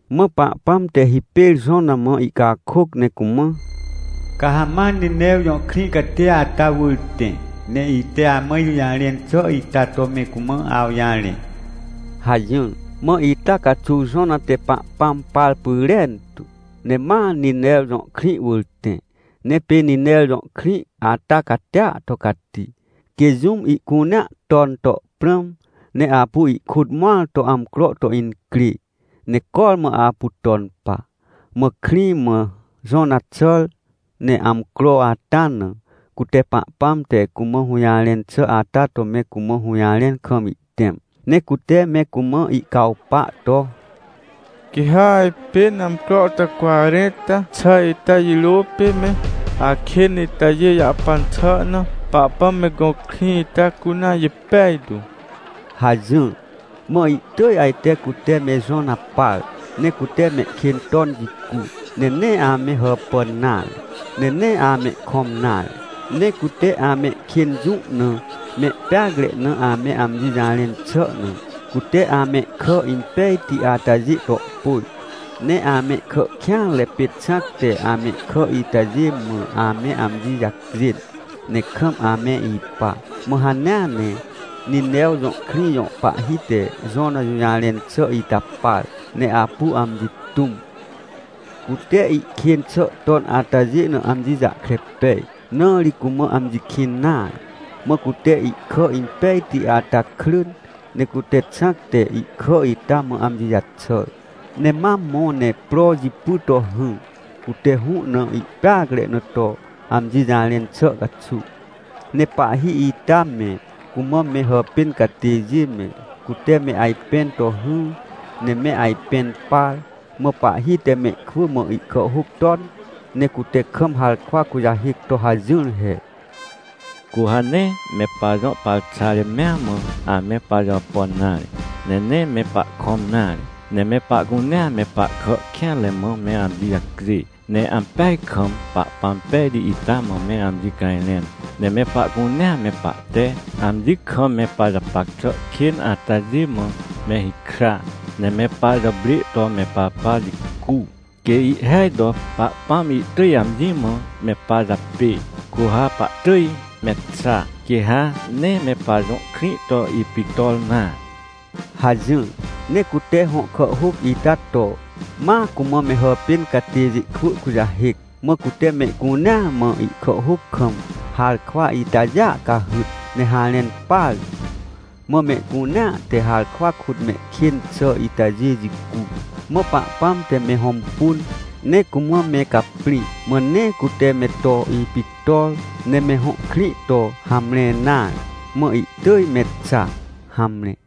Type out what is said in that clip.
Mã Pahpãm te hipêr Jona mã ihcakôc ne cumã: — Ca ha ma Ninew jõ krĩ catia ata wỳr tẽ, ne ite amã ijũjarẽn xà ita to me cumã awjarẽ — hajỹr. Mã ita caxuw Jona te Pahpãm par pyrentu, ne ma Ninew jõ krĩ wỳr tẽ. Ne pê Ninew jõ krĩ ata catia to cati, quê jũm ihcunea ton to prãm, ne apu ihkôt mõr to amcro to incrê, ne cormã apu ton pa. Mã krĩ mã Jona xàr, ne amcro ata na, cute Pahpãm te cumã hũjarẽn xà ata to me cumã hũjarẽn kam ihtẽm, ne cute me cumã ihcawpa to: “Quê ha ajpên amcro te cwarẽnta xà ita jirô pê me akên itajê jahpan xà na, Pahpãm me gõ krĩ ita cunea jipej tu!” hajỹr. Mã ihtỳj ajte cute me Jona par. Ne cute mehkên ton jicu. Ne nee ame hàpàn nare, ne nee amehkõm nare. Ne cute amehkên jũ na mehpeacre na ame amji jarẽn xà na, cute amehkà impejti atajê to pôj, ne amehkà kêanre pê xãc te amehkà itajê mã ame amji jacjên, ne kam ame ipa. Mã hanea ne Ninew jõ krĩ jõ pahhi te Jona jũjarẽn xà ita par, ne apu amji tũm. Cute ihkên xà ton atajê na amji jahkre pej, na ri cumã amji kĩn nare. Mã cute ihkà impejti ata krỳn, ne cute xãc te ihkà ita mã amji jaxàr, ne ma mõ ne pro jipy to hỹr, cute hũ na ihpeacre na to amji jarẽn xà caxuw. Ne pahhi ita me, cumã me hàpên catêjê me, cute me ajpẽn to hỹr, ne me ajpẽn par. Mã pahhi te mehkwỳ mã ihkàhhôc ton, ne cute kam harkwa kujahêc to hajỹr he: “Cu ha nee, me pajõ parxare mea mã, ame pajàpàn nare, ne nee me pahkõm nare. Ne me pahcunea me pahkà kêanre mã me amji jacjê, ne ampeaj kam Pahpãm pejti ita mã me amji cajrẽn. Ne me pahcunea me pahte amji kam me pajapac xà kên atajê mã me hikra, ne me pajàprê to me papa jicu, quê ihhêaj to Pahpãm ihtỳj amji mã me pajapê, cu ha pahtỳj me xa, quê ha nee me pajõ krĩ to ipictor nare” hajỹr. Ne cute hõ kàhhôc ita to, ma cumã me hàpên catêjê kwỳ kujahêc. Mã cute mehcunea mã ihkàhhôc kam harkwa itajêa cahyt, ne harẽn partu. Mã mehcunea te harkwa kôt mehkên xà itajê jicu. Mã Pahpãm te me hõmpun, ne cumã me caprĩ, mã nee cute me to ipictor, ne me hõ krĩ to hamre nare, mã ihtỳj me xa. Hamre.